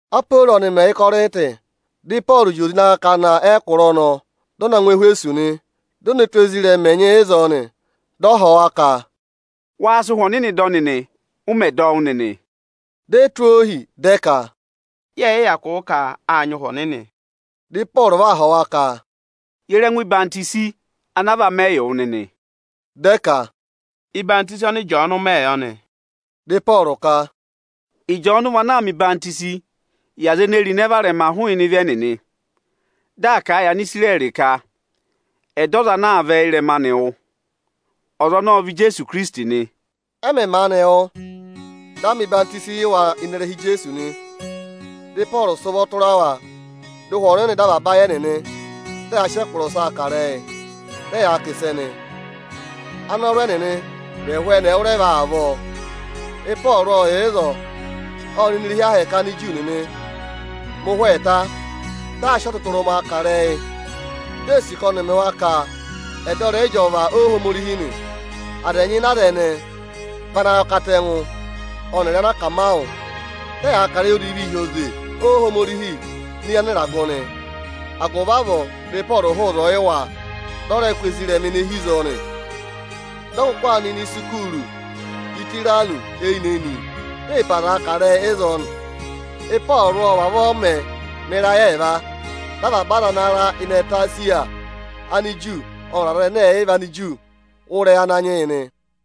Aporo ọnị mẹ̀ yà Ịkọrịntị, dị Ịpọọrụ zị oze ịnị akakana ẹkụra ọnọọ, dị ọ na ngụ Ẹhwẹsọsị nị. Di o ne tù ezirẹma ẹnyị ịzọọ nị. Dị ọ họ̀ wa ka, “Wáá sị Ụhwẹ Ọnịnị dọ, ụ mẹ̀ dọ wụ́ nịnị?” Di e tụ́ ohi, dị ẹ ka, “Yẹẹ̀ yị hyakụ wụ́ ka â nyị Ụhwẹ Ọnịnị.” Dị Ịpọọrụ va họ̀ wa ka, “Ye re ẹngụ ọyịhwenyi ana a va mẹ yị wụ nịnị?” Dị ẹ ka, “Ọyịhwọzenyi ọnị Ịjọọnụ mẹ yọ nị.” Dị Ịpọọrụ ka, “Ịjọọnụ vị ana aa mẹ̀ ọyịhwọzenyi yị aza ene èe ro ịnẹ varẹma hụụnị ịvị ẹnịnị. Dị aa kà a yị Anisirẹrị ka ẹ̀ dọ ọza ana aa vẹ ịrẹma anị wụ́. Ọza ọnọọ ọ vị Ijeesu Ikirisiti nị.” Ẹ mẹ̀ maanị wụ́, dị a mẹ̀ ọyịhwọzenyi yị wa ịnị ịrẹha Ijeesu nị. Dị Ịpọọrụ sị ụvọ tụra wa, dị Ụhwẹ Ọnịnị dọ avaba ayị ẹnịnị, dị ẹyaa sị ẹkụra ọsaa kà ịrẹyị, dị ẹyaa kà ịsẹ nị. Anọrụ ẹnịnị vị ẹhụụ ẹwụrẹva avọọ. Ịpọọrụ ộ yà ịzọọ, ộ nọ ini irehi Ohomorihi Aniju nịnị mẹ ụhwẹ ẹẹta, dị aa sị ọtụtụrụma kà ịrẹyị, di ee sì ka ọnị ọ̀ mẹ wa ka ẹ̀ dọ ịrẹyị ịjọva Ohomorihi nị. Aza ẹnyị ịnị aza ẹnẹẹ vị anayọkatẹngụ ọnịrị anakamawụ. Dị ẹyaa kà ịrẹyị odivii hi oze Ohomorihi ini eyi anịragụ nị. Agụvị avọọ, dị Ịpọọrụ hụụ ịzọọ yị wa, dị ọ rẹ kụ́ ezirẹma ene ịhị ịzọọ nị. Dị ọ kụkụ aa nọ ini isukuuru Ịtayịranọsị eyinị-eyinị, di ee pe azaa kà ịrẹyị ịzọọ nị. Ịpọọrụ ộ vavọọ mẹ̀ ẹ mẹ ịrayị ẹẹva. Dị avaba aza ana ra ịnị ẹtẹ Esiya, Aniju ọnịrị Anigiriki, wụ́ ịrẹyị Ananyị yị nị.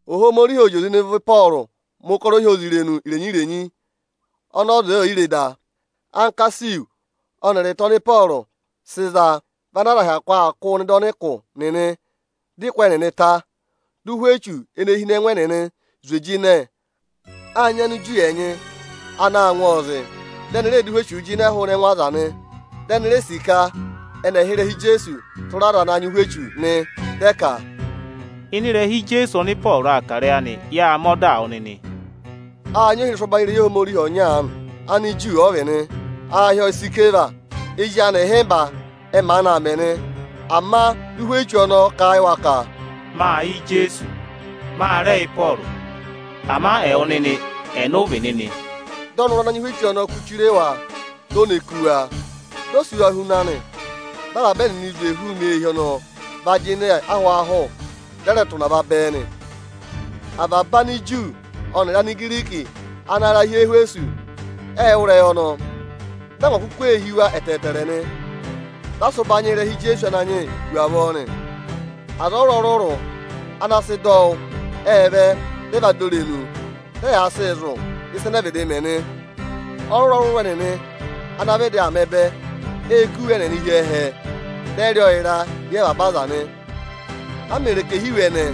Ohomorihi ộ zị oze ịnị ụvọ Ịpọọrụ mẹ̀ ụkọrọ ohyozirenu irenyi-irenyi ọnị ọza oò yi re da. Ankasihu ọnịrị ịta ọnị Ịpọọrụ sị za vị ana aza hyakụ aa kụ́ụ nọ ịdị ọnịkụ nịnị; dị ụkụ ẹnịnị ta, dị ụhwẹ echu ene hi ẹngụ ẹnịnị zwe jịnẹ. Â nyị Aniju ẹnyị anaā ngwọọ zị, dị ẹnị rẹẹ̄ dụ ụhwẹ echuu jịnẹ hụụnị ẹngụ aza nị. Ẹnị ree sì ka ẹnị ẹ̀ hị́ ịrẹha Ijeesu tụra aza ana nyị ụhwẹ echu. Dị ẹ ka, “Ịnị ịrẹha Ijeesu ọnị Ịpọọrụ aa kà ịrẹyị anị, yáa mẹ ọdaa wụ nịnị!” Â nyị ohirẹsụ ọbanyị irehi Ohomorihi ọnya aanị. Aniju ọ vị nị, aā hị́ ọọ Isikeva. Ezi anị ịhịmba ẹ maanị aa mẹ nị. Ama dị ụhwẹ echu ọnọọ kà a yị wa ka, “Mâ yẹ Ijeesu, ma rẹ yẹ Ịpọọrụ, ama ẹwụ nịnị, ẹnị ụ vị nịnị?” Dị ọnọrụ ana nyị ụhwẹ echu ọnọọ kú chire wa, di o ne kú wa, dị ọ sị wa huna nị. Avaba ẹnịnị ê zwe hụụnị eehi ọnọọ va jịnẹ ịnị ahwaahụ, dị ẹ rẹ tụ̀ ụnava bẹẹ nị. Avaba Aniju ọnịrị Anigiriki ana ra hi Ẹhwẹsọsị, ệ wụ́ ịrẹyị ọnọọ, dị angwa kuku ee hí wa ẹtẹẹtẹrẹ nị. Dị a sị ụbanyị yị ịrẹha Ijeesu Ananyị yị hu avọọ nị. Aza ọrụrụ-ọrụrụ ana sị dọ wụ́, ệ vẹ, dị ẹ va dọ irenu, dị ẹyaa sịị zụ̀ ịsa ẹnẹ ẹ vịdị mẹ nị. Ọrụrụ-ọrụrụ ẹnịnị ana vịdị aa mẹ ẹbẹ, ệ kụ́ iwe ẹnịnị hi ẹhẹ, dị ẹ rị ọọ ịra éyi avaba aza nị. A mè ro ẹkẹhị iwe ẹnẹẹ,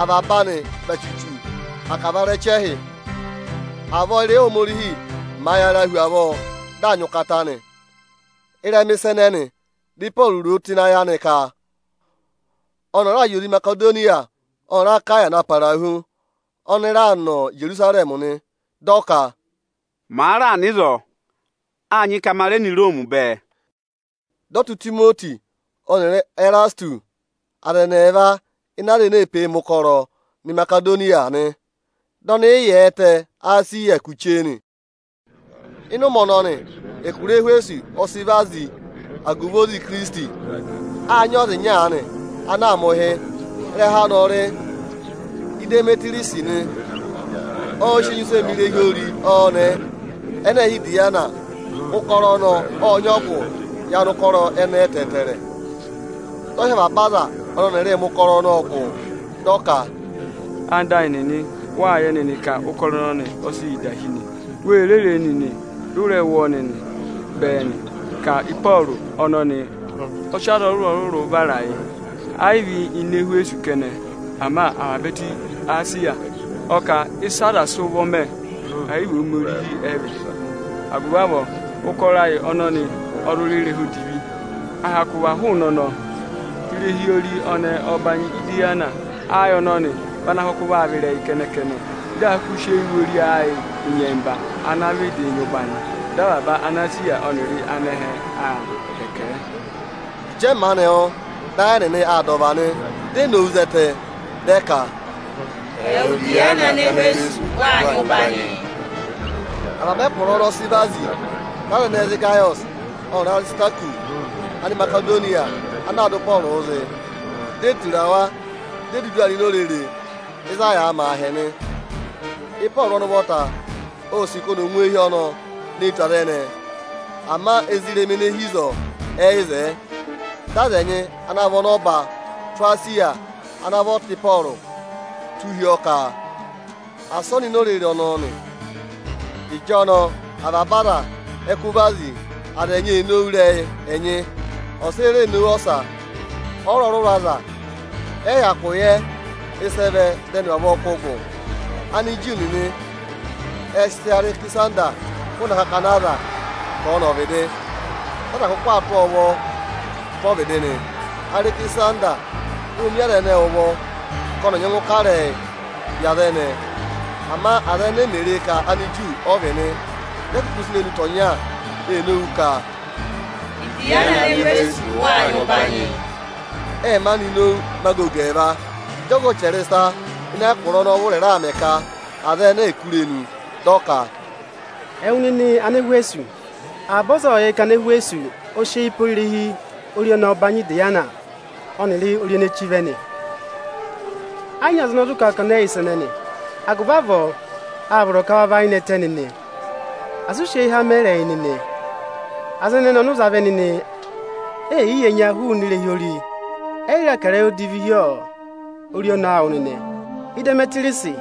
avaba anị vị achuchu akavarẹchẹhị. Avọọ ị́rẹyị Ohomorihi màa yaraa hu avọọ, dị aa nyị ụkata nị. Ịrẹma ịsa ẹnẹnị, dị Ịpọọrụ ro o tụ́ ịnị ayị anị ka, ọnị ọ̀ọ raà zị oze Imasedoniya ọnịrị Akaya na para hu, ọnị raa nọ Ijerusarẹmị nị. Dị ọ ka, “Màa raà nọ ịzọọ, â nyị ka ma rẹ nọ Iroomi bẹẹ.” Dị ọ tụ́ Itimoti ọnịrị Ẹrasịtụsị, aza ẹnị ẹẹva ịnị aza ene ee pee mẹ̀ ụkọrọ, nọ Imasedoniya nị. Dị ọnị yị yà ẹtẹ Esiya kù chee nị. Ịnị ụmẹ ọnọnị, ẹkụra Ẹhwẹsọsị ọ sị vazi agụvị oze Ikirisiti. Â nyị ọza ịnya aanị anaā mẹ̀ ụhị. Ịrẹha anị ọ rị Idemetiriyọsị nị. Ọọ̄ sị enyusẹ mẹ irehi ori ọnẹẹ ẹnẹ ẹẹ̄ hị́ Atemiisi ana aza ẹnyịị hị́ Idiyana. Ụkọrọ ọnọọ ộ nyị ọgụ yị anụkọrọ ẹnẹẹ ẹtẹẹtẹrẹ. Dị ọ hị́ avaba aza ọnị ọnịrịị̄ mẹ̀ ụkọrọ ọnọọ gụ, dị ọ ka, “Ẹwụ nịnị ẹyịnyara amị, wâ yẹ nịnị ka ụkọrọ ọnọnị ọ sị yị da hí nị. Wê ree nịnị, dị ụ rẹ wụ́ ọọ nịnị bẹẹ nị ka Ịpọọrụ ọnọnị ọ sị aza ọrụrụ-ọrụrụ vara ayị, ayị vị ini Ẹhwẹsọsị kẹnẹ, ama avaba ẹtẹ Esiya. Ọ kà ịsị aza sị ụvọ mẹ, ayị vị Ohomorihi ẹ vị. Agụvị avọọ, ụkọrọ ayị ọnọnị ọ zụ rị ịrẹha odivi. À hyakụ va hụụnị ọnọọ, irehi ori ọnẹẹ ọbanyị Idiyana ayị ọnọnị vị ana kụkụ vaa vị ịrẹyị kẹnẹ-kẹnẹ. Dị a kụkụ aa sị eyii wụ ori ayị ịnyẹmba ana vịdị nyị ụbanyị, dị avaba Anesiya ọnịrị anẹhẹ aa hẹkẹ ẹ.” Ịjị ẹ maanị wụ́, dị ayị ẹnịnị aa dà ọva nị, di e nowu zẹtẹ, dị ẹ ka, “Ẹwụ Idiyana Anẹhwẹsọsị waa nyị ụbanyị!” Avaba ẹkụra ọnọọ ọ sị vazi. Dị aza ẹnẹẹ za Ịgayọsị ọnịrị Arisitakọsị, Animasedoniya ana aa dụ Ịpọọrụụ zị, di e tura wa di e dudu aa nọ ini orere ịzị a yàā mẹ aahẹ nị. Ịpọọrụ ọnị ụvọta ô sì ka ọnị ọ̀ ngụ eehi ọnọọ ne tù aza ẹnẹẹ, ama ezirẹma ene hi ịzọọ ẹyị zẹẹ. Dị aza ẹnyị ana vị ọnọba tụ́ Esiya ana vị ọta Ịpọọrụ tụ́ hi ọọ ka asị ọ nọ ini orere ọnọọ nị. Ịjọnọọ, avaba aza ẹ kụ́ vazi. Aza ẹnyị ee nowu ịrẹyị ẹnyị, ọsa eni ree nowu ọsa. Ọrụrụ-ọrụrụ aza ẹnyị ẹyị hyakụ yẹ ịsị ẹ vẹ dị ẹnị vavọọ kụ́ gụ. Aniju nịnị ệ sị Arẹkịsanda hụụnị akakana aza ka ọ̀ nọ ọvịdị, dị aza kụkụ tụ́ ọọ ụvọ tụ́ ọvịdị nị. Arẹkịsanda ô mi aza ẹnẹẹ ụvọ ka ọnị ọ̀ nyẹngụ kà ịrẹyị yị aza ẹnẹẹ. Ama aza ẹnẹẹ mè re ka Aniju ọ vị nị, dị ẹ kụkụ sị irenu tọ̀ ọnya ee nowu ka, “Idiyana Anẹhwẹsọsị wa nyị ụbanyị!” Ệ maanị nowu mẹ agogo ẹẹva. Ịjị ọga ọchẹrịsa ịnị ẹkụra ọnọọ vụrị raà mẹ ka aza ẹnẹẹ è kú irenu, dị ọ ka, “Ẹwụ nịnị Anẹhwẹsọsị avaba ọza ộ yẹ ka Anẹhwẹsọsị e sị eyi pe irehi ori ọnẹẹ ọbanyị Idiyana ọnịrị ori ene chí vẹ nị. Ẹ yị nyị ọza ana zụ kà a ka ọnị ọyị yẹ ịsa ẹnẹnị. Agụvị avọọ â vọrọ ka wa và ayị nẹtẹ nịnị, asị ụ sị eyiha mẹ ịrẹyị nịnị! Aza ẹnẹnị ọnị ụ za vẹ nịnị, eyi yi ẹnya hụụnị irehi ori, ẹyị rẹ kà ịrẹyị odivi hi ori ọnẹẹ awụ nịnị. Idemetiriyọsị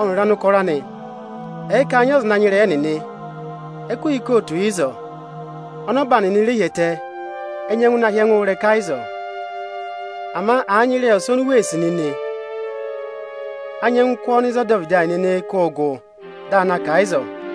ọnịrị anụkọrọ anị ẹ̀ẹ ka â nyị ọza ana nyị ịrẹyị ẹnịnị, ẹkụhị ikootu yà ịzọọ, ọnọba nịnị re hi ẹtẹ, ẹ nyẹngụ na hị́ ẹngụ ịrẹka ịzọọ. Ama àa nyị ịrẹyị ọsa oni u wee sì nịnị, a nyẹngụ kụ́ ọọ nọ ịzị ọdọvịdị ayị nịnịị̄ kụ́ gụ, di aa na kà a ịzọọ.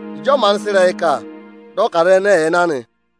Ịjị ọ maanị sị ịrẹyị kà, dị ọ ka aza ẹnẹẹ ẹ̀ẹ na nị.